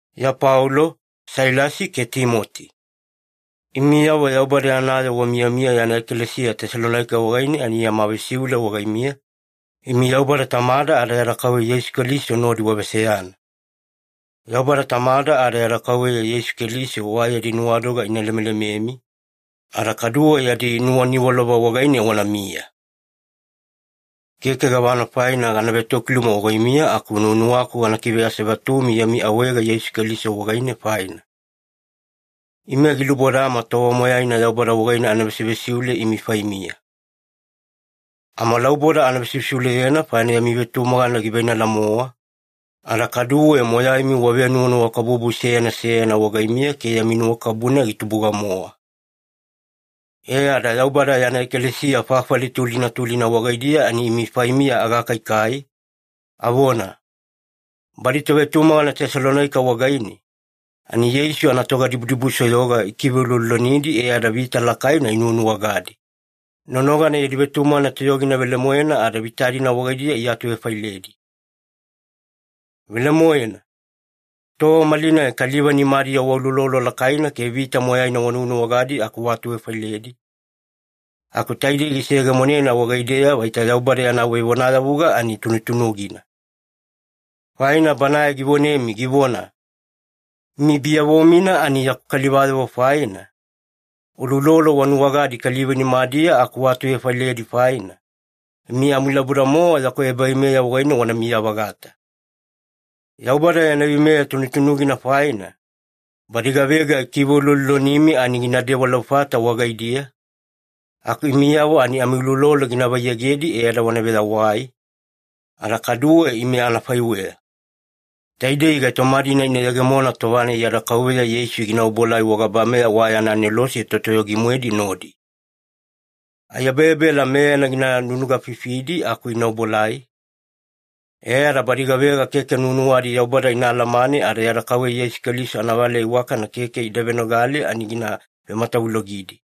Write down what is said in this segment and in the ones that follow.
Iya Paulo, Sailasi ke Timoti. Imiyavo Yaubada yana yoo wamiyamiya yana ekalesiya Tesalonaika wagaine ani yama vesiule wagaimiya, imi Yaubada Tamada ada yada Kauveya Yeisu Keliso nodi waveseyana. Yaubada Tamada ada yada Kauveya Yeisu Keliso wa yadi nuwadoga ina lemelememi, ada kaduwe yadi nuwaniwalova wagaine wanamiya. Keke gavana faina gada vetokiluma wagaimiya aku nuwanuwaku gana kiveasevatumi yami awaega Yeisu Keliso wagaine faina. Ime gilubodama tova moyaina Yaubada wagaine ana vesivesiule imi faimiya. Amalauboda ana vesivesiuleyena faina yami vetumagana giveinala-mowa, ada kaduwe moyaimi wavenuwanuwakabubu seyana seyana wagaimiya ke yami nuwakabubu-nai gitubuga-mowa. E ada Yaubada yana ekalesiya fafali tulina tulina wagaidiya ani imi faimiya agakaikai, avona, “Badi tovetumagana Tesalonaika wagaine, ani Yeisu anatogadibudibusoyoga ikiveuloulolonidi e ada vita lakaina inuwanuwagadi, nonogana yadi vetumagana toyogina velemoena ada vita-dina wagaidiya iatuvefailedi.” Velemoena, tova malinai kaliva nimadiya wauloulolo lakaina ke vita moyaina wanuwanuwagadi aku waatuvefailedi, aku taidei giseyegemonena wagaideya vaita Yaubada yana vevonayavuga ani tunutunugina. Faina Banae givonemi givona, “Imi biyavo-mina ani yaku kalivayavo faina, uloulolo wanuwagadi kaliva nimadiya aku waatuvefailedi faina, imi amilauboda-mowa yaku ebaveimeya wagaine wanamiya-vagata.” Yaubada yana veimeya tunutunugina faina, badi gavega ikiveuloulolonimi ani ginadewa laufata wagaidiya, aku imiyavo ani amiuloulolo gina vaiyegedi e ada wana veyawai, ada kaduwe ime anafaiweya. Taidei gaitoma-dina ina yegemona tova-nai yada Kauveya Yeisu gina obuelai wagabameya wa yana anelose totoyogi-moedi nodi. Aiyabeyabela meyana gina nunugafifidi aku ina obuelai, e ada badi gavega keke nuwanuwadi Yaubada ina alamane ada yada Kauveya Yeisu Keliso anavaleya iwakana keke ida venogale ani gina vematavulogidi.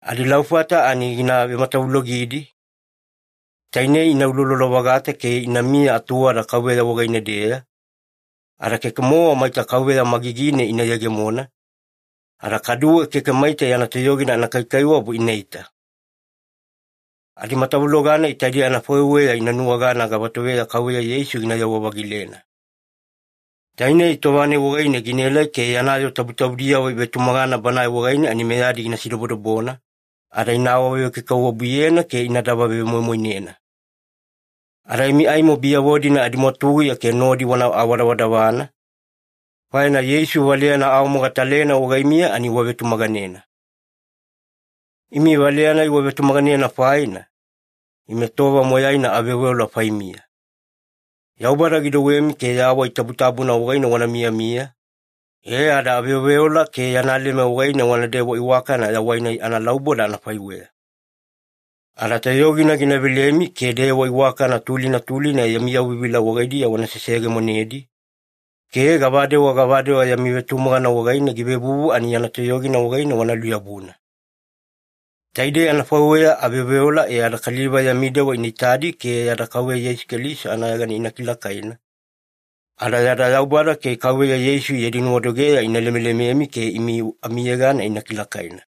Adilaufata ani gina vematavulogidi, tainei ina uloulolo-vagata ke inamiya atuwada Kauveya wagaine-deya, ada keke-mowa maita Kauveya magigine ina yegemona, ada kaduwe keke maita yana toyogina anakaikaiwabu inaita. Adimatavuloga-nai taidei anafaiweya ina nuwagana gavatoveya Kauveya Yeisu ginayewa-vagilena. Tainei tova-nai wagaine ginaelai ke yana yoo tabutabudiyavo ivetumagana Banae wagaine ani meyadi gina sidobodobona, ada ina awavekaikaiwabuyena ke inadava vemoimoinena. Ada imi aimo biyavo-dina adimwatuguya ke nodi wana awadavadavana, faina Yeisu valeyana aawamogatalena wagaimiya ani wavetumaganena. Imi valeyana-nai wavetumaganena faina, ime tova moyaina aveoveola faimiya. Yaubada gidouwemi ke yawai tabutabuna wagaine wana miyamiya, e ada aveoveola ke yana leme wagaine wanadewa iwakana yawai-nai analauboda anafaiweya. Ada toyogina gina velemi ke dewa iwakana tulina tulina yami yauvivila wagaidiya wana seseyegemonedi, ke gavadewa gavadewa yami vetumagana wagaine givevuvu ani yana toyogina wagaine wana luyabuna. Taidei anafaiweya aveoveola e ada kaliva yami dewa ina itadi ke yada Kauveya Yeisu Keliso anayegana ina kilakaina, ada yada Yaubada ke Kauveya Yeisu yadi nuwadogeya ina lemelememi ke imi amiyegana ina kilakaina.